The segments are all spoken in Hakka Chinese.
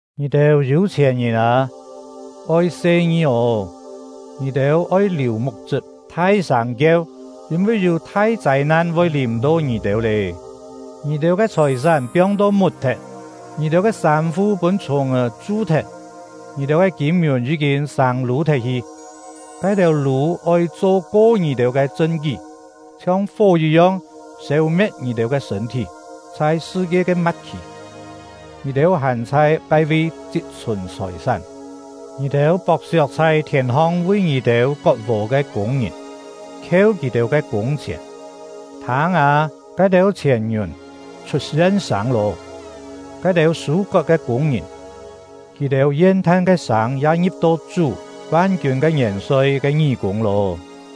Ngì-têu yû-chhièn-ngìn â, oi se-ngi ô! Ngì-têu oi liù muk-chṳp thai-sâng kieu, yîn-vi yû thai châi-nan voi lìm-to ngì-têu lé! Ngì-têu ke chhòi-sán piong-to mut-thet, ngì-têu ke sâm-fu pûn chhùng-è chu-thet. Ngì-têu ke kîm-ngiùn yí-kîn sâng-lû thet-hi; ke-têu lû oi cho ko ngì-têu ke chṳn-kí, chhiong fó yit-yong sêu-me̍t ngì-têu ke sṳ̂n-thí. Chhai sṳ-kie ke ma̍t-khì, ngì-têu hàn chhai ke-vi chit-chhùn chhòi-sán! Ngì-têu pok-siok chhai thièn-hong vi ngì-têu kot-vò ke kûng-ngìn, khieu kì-têu ke kûng-chhièn. Thâng â, ke-têu chhièn-ngiùn chhut yen-sâng lô; ke-têu sû-kot ke kûng-ngìn, kì-têu yen-than ke sâng ya ngi̍p-to Chú — Van-kiûn ke Ngièn-soi ke ngí-kûng lô!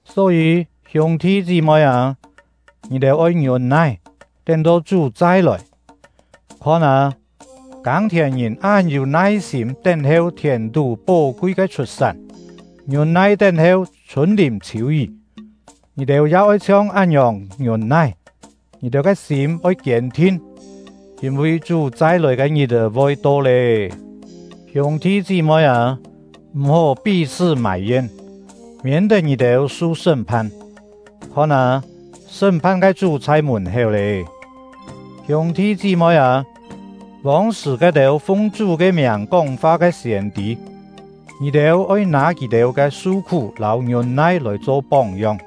Só-yî, hiûng-thi chí-moi â, ngì-têu oi ngiûn-nai, tén-to Chú chai-lòi. Khon â, kâng-thièn-ngìn án yû nai-sîm tén-heu thièn-tú pó-kui ke chhut-sán, ngiûn-nai tén-heu chhûn-lìm chhiû-yí. Ngì-têu ya oi chhiong án-ngiòng ngiûn-nai. Ngì-têu ke sîm oi kiên-thin, yîn-vi Chú chai-lòi ke ngit-è voi to lé. Hiûng-thi chí-moi â, m̀-hó pí-chhṳ́ mài-yen, miên-tet ngì-têu su sṳ́m-phan; khon â, sṳ́m-phan ke Chú chhai mùn-héu lé. Hiûng-thi chí-moi â, vông-sṳ̀ ke-têu fung Chú ke miàng kóng-fa ke siên-tî, ngì-têu oi nâ kì-têu ke su-khú lâu ngiûn-nai lòi cho póng-yong.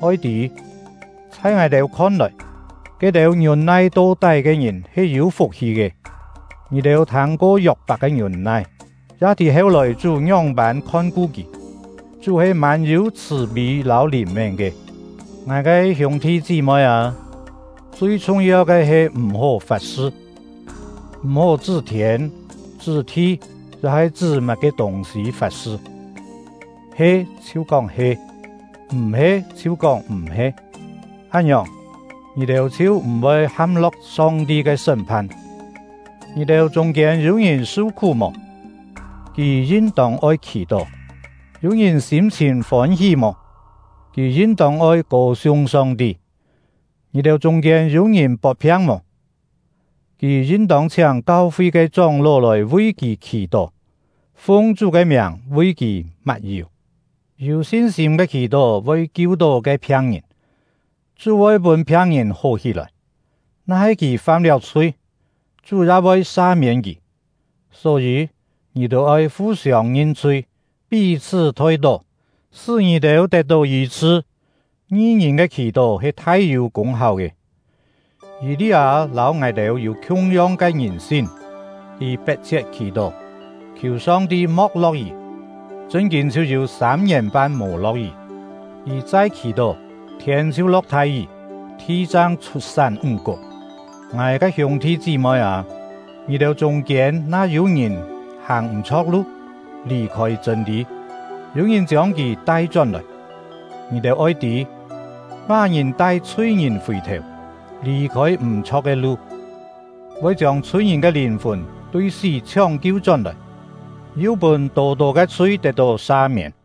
Oi tî, chhai ngài-têu khon-lòi, ke-têu ngiûn-nai to-tái ke ngìn he yû fuk-hi ke. Ngì-têu thâng-ko Yok-pak ke ngiûn-nai, ya tî heu-lòi Chú ngióng-pân khon-ku kì. Chú he mân-yû chhṳ̀-pî lâu lìn-mén ke. Ngài ke hiûng-thi chí-moi â, chui chhung-yeu ke he m̀-hó fat-sṳ! M̀-hó chṳ́ thiên, chṳ́ thi, ya-he chṳ́ má-ke tûng-sî fat-sṳ. He, chhiu kóng “He”; m̀-he, chhiu kóng “M̀-he”. Án-ngiòng, ngì-têu chhiu m̀-voi ham-lo̍k Song-ti ke sṳ́m-phan. Ngì-têu chûng-kiên yû-ngìn su-khú mò? Kì yin-tông oi khì-tó. Yû-ngìn sîm-chhìn fôn-hí mò? Kì yin-tông oi kô-siung Song-ti. Ngì-têu chûng-kiên yû-ngìn pot-phiang mò? Kì yin-tông chhiáng kau-fi ke chóng-ló lòi vi kì khì-tó, fung Chú ke miàng vi kì mat-yù. Yû sin-sîm ke khì-tó voi kiu-tó ke phiang-ngìn; Chú voi pûn phiang-ngìn hó hí-lòi; na-he kì fam-liáu chhui, Chú ya voi sa-miên kì. Só-yî, ngì-têu oi fu-siông ngin-chhui, pí-chhṳ́ thoi-tó, sṳ́ ngì-têu tet-tó yî-chhṳ. Ngi-ngìn ke khì-tó he thai-yû kûng-háu ke. Yî-li-â lâu ngài-têu yû khiung-yong ke ngìn-sin; kì pet-chhiet khì-tó, khiù Song-ti mo̍k lo̍k-yí, chṳn-kîn chhiu yû sâm-ngièn-pan mò lo̍k-yí. Kì chai khì-tó, thiên chhiu lo̍k thai-yí, thi chang chhut-sán ńg-kuk. Ngài ke hiûng-thi chí-moi â, ngì-têu chûng-kiên na yû-ngìn hàng m̀-chho̍k lu, lì-khôi chṳ̂n-lî, yû-ngìn chiông kì tai-chón-lòi, ngì-têu oi tî: Má-ngìn tai chhui-ngìn fì-thèu, lì-khôi m̀-chho̍k ke lu, voi chiông chhui-ngìn ke lìn-fùn tui sí chhióng-kiu chón-lòi, yu pûn tô-tô ke chhui tet-tó sa-miên.